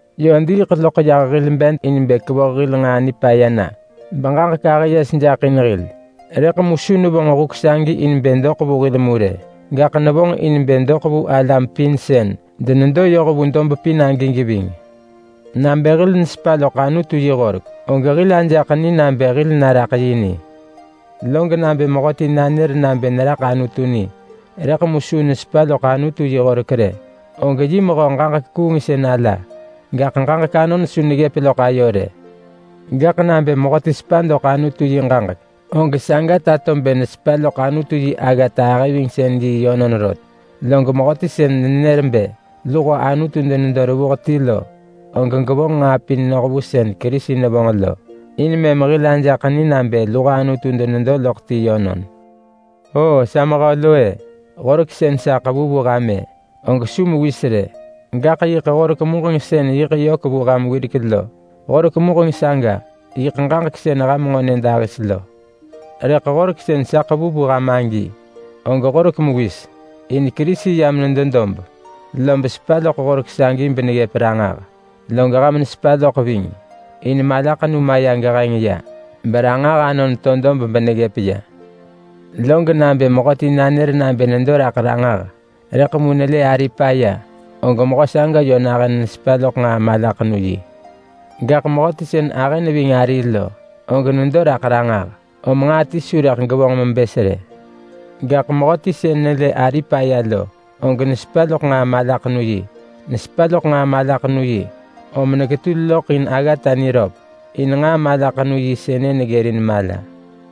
Yö diiḳ loḳ yah hil bed in bë kevoh hil nġaa nipaya na beġaġek ahë yes jaḳ in hil. Rëḳ mu su nevonġ huk sagi in bë doḳ vu hil mu rë, gaḳ nevonġ in bë doḳ vu alam pin sën denedo yoh vu dob pin agi geving. Nabë hil nesepa loḳ Anutu yi horek, og hil ajaḳ ni nabë hil naraḳ yi ni. Log nabë mehöti nanër nabë neraḳ Anutu ni, rëḳ mu su nesepa loḳ Anutu yi horek rë, og yi mehö ġaġek kuungsën ala, gaḳ ġaġek anon su neggëp loḳ ayo rë. Gaḳ nabë mehöti sepa doḳ Anutu yi ġaġek, og saga tato bë nesepa loḳ Anutu yi aggata ahëvingsën-yi yönon rot. Log mehöti sën nenër bë luho Anutu denedo revuh ti lo, og gevonġ nġaa pin noh vu sën Kerisi nevonġ lo, in mëm hil ajaḳ ni nabë luho Anutu denedo loḳ ti yönon. O sa mehö lo-e! Horek sën sa ḳevu vu ham-ë, og su mewis rë, gaḳ yiḳ horek muġeng sën yiḳ yök vu ham wirek lo. Horek muġeng saga yiḳ ġaġek sën ham nġo nyëdahis lo. Rëḳ horek sën sa ḳevu vu ham agi, og horek mewis. In Kerisi yam nedo dob, lob sepa loḳ horek sagi beneggëp ranġah, log ham nesepa loḳ ving. In malaḳenu maya geheng ya, beranġah anon to dob beneggëp ya. Log nabë mehöti nanër nabë nedo raḳ ranġah, rëḳ mu nelë ari paya, og mehö saga yö nahën nesepa loḳ nġaa malaḳenu-yi. Gaḳ mehöti sën ahë neving ari lo, og nedo raḳ ranġah, om nġaa ti su rëḳ gevonġ mebës rë. Gaḳ mehöti sën nelë ari paya lo, og nesepa loḳ nġaa malaḳenu-yi. Nesepa loḳ nġaa malaḳenu-yi om neketul loḳ in aggata niröp, in nġaa malaḳenu-yi sënë neggërin mala.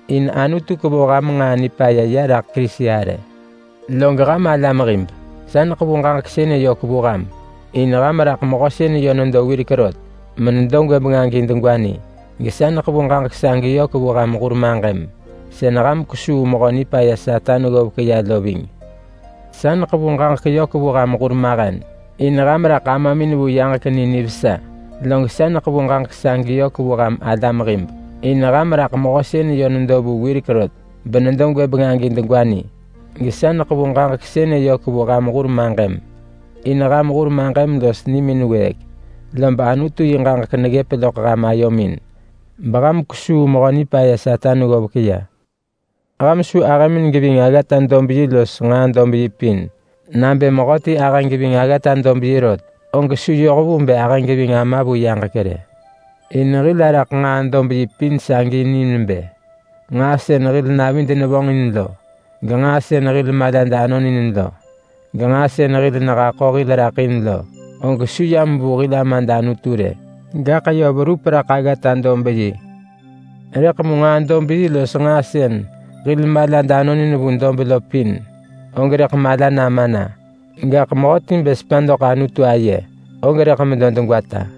in Anutu kevoh ham nġaa nipaya ya raḳ Kerisi arë. Log ham alam hib, sa neḳevu ġaġek sënë yök vu ham, in ham raḳ Mehö sën yö nedo wirek rot menedo gwëbeng agi degwa ni. Gesa neḳevu ġaġek sagi yök vu ham hur maġëm sën ham kwesuu Mehö Nipaya Satan ggovek ya lo ving. Sa neḳevu ġaġek yök vu ham hurmahen in ham raḳ Amamin vu yaġek ni nivesa. Log sa neḳevu ġaġek sagi yök vu ham alam hib in ham raḳ Mehö sën yö nedo vu wirek rot benedo gwëbeng agi degwa ni. Gesa neḳevu ġaġek sënë yök vu ham hur maġëm, in ham hur maġëm los nimin wëëk, lob Anutu yi ġaġek neggëp loḳ ham ayomin beham kwesuu Mehö Nipaya Satan ggovek ya. Ham su ahëmin geving aggata-dob-yi los nġaa-dob-yi pin. Nabë mehöti ahë geving aggata-dob-yi rot, og su yoh vu bë ahë geving Ama vu yaġek rë. In hil araḳ nġaa-dob-yi pin sagi ni bë nġaa sën hil navid nevonġin lo, genġaa sën hil malad anon in lo, genġaa sën hil nehaḳo hil raḳ in lo, og su yam vu hil Amad Anutu rë. Gaḳ yö verup raḳ aggata-dob-yi. Rëḳ mu nġaa-dob-yi los nġaa sën hil malad anon in vu dob lo pin, og rëḳ mala nama na. Gaḳ mehöti bë sepa doḳ Anutu aye, og rëḳ medo degwata.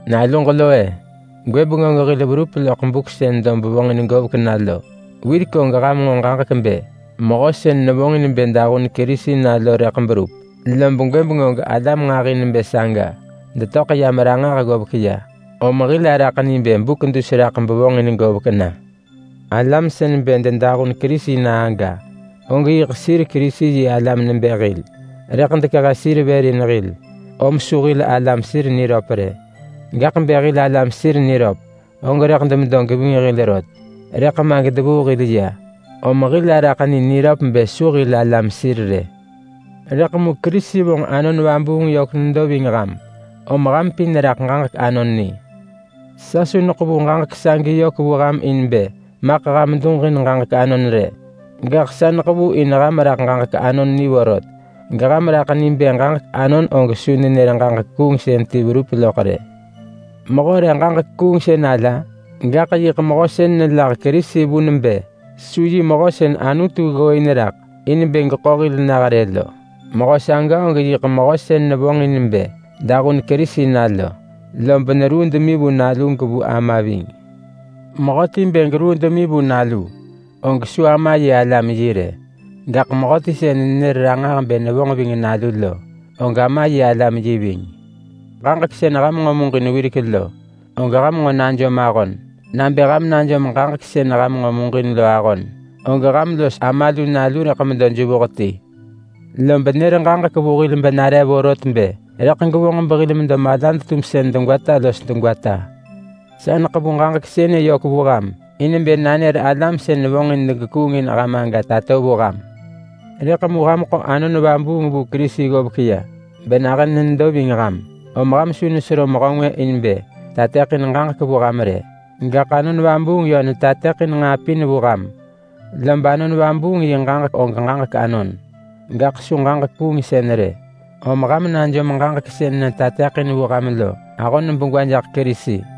Naluġ lo-e! Gwëbeng og hil verup loḳ buk sën dob vonġin govek na lo. Wirek og ham nġo ġaġek bë mehö sën nevonġin bë dahun Kerisi na lo rëḳ berup. Lob gwëbeng og alam nġahi nebë saga detöḳ yam ranġah ggovek ya, om hil araḳ ni bë buk dus raḳ bevonġin govek na. Alam sën bë dedahun Kerisi na aga, og yiḳ sir Kerisi-yi-alam nebë hil. Rëḳ dekehe sir vër in hil, om su hil alam sir niröp rë. Gaḳ bë hil alam sir niröp, og rëḳ demedo geving hil rot. Rëḳ ma gedevuu hil ya, om hil araḳ ni niröp bë su hil alam sir rë. Rëḳ mu Kerisi vonġ Anon Vabuung yök nedo ving ham, om ham pin raḳ ġaġek anon ni. Sa su neḳevu ġaġek sagi yök vu ham in bë maḳ ham duġin ġaġek anon rë! Gaḳ sa neḳevu in ham raḳ ġaġek anon ni vorot geham raḳ ni bë ġaġek anon og su nenër ġaġek kuungsën ti verup loḳ rë. Mehö re ġaġek kuungsën ala? Gaḳ yiḳ mehö sën nelah Kerisi vun bë su yi mehö sën Anutu ggooin raḳ in bë geḳo hil nah rë lo. Mehö saga og yiḳ mehö sën nevonġ in bë dahun Kerisi na lo, lob neruu demi vu Nalu gevu Ama ving. Mehöti bë geruu demi vu Nalu, og su Ama yi alam yi rë. Gaḳ mehöti sën nenër ranġah bë nevonġ ving Nalu lo, og Ama yi alam yi ving. Ġaġek sën ham nġo wirek muġin lo, og ham nġo najom ahon. Nabë ham najom ġaġek sën ham nġo muġin lo ahon, og ham los Ama lu Nalu rëḳ medo jevuh ti. Lob nër ġaġek vu hil benare vorot bë rëḳ gevonġ behil medo malad-tumsën degwata los degwata. Sa neḳevu ġaġek sënë yök vu ham in bë nanër alam sën vonġin degekuung in ham aga tato vu ham. Rëḳ mu ham ḳo Anon Vabuung vu Kerisi ggovek ya benahën nedo ving ham. Om ham su nesero mehö ngwë in bë tateḳin ġaġek vu ham rë, gaḳ Anon Vabuung yö netateḳin nġaa pin vu ham. Lob Anon Vabuung yi ġaġek og ġaġek anon, gaḳ su ġaġek kuungsën rë, om ham najom ġaġek sën netateḳin vu ham lo ahon begwa jaḳ Kerisi.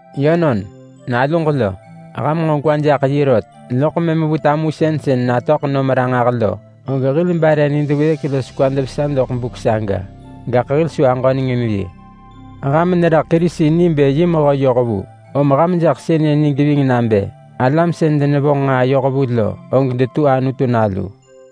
Yönon, naluġ lo! Ham nġo gwa jaḳ yi rot, loḳ mëm vu tamusën sën natöḳ nom ranġah lo, og hil bare nid wëëk los kwad vesa doḳ buk saga, gaḳ hil su aġöneng in yi. Ham neraḳ Kerisi ni bë yi mehö yohvu, om ham jaḳ sënë ni geving nabë alam sën denevonġ nġaa yohvu lo, og detu Anutu nalu.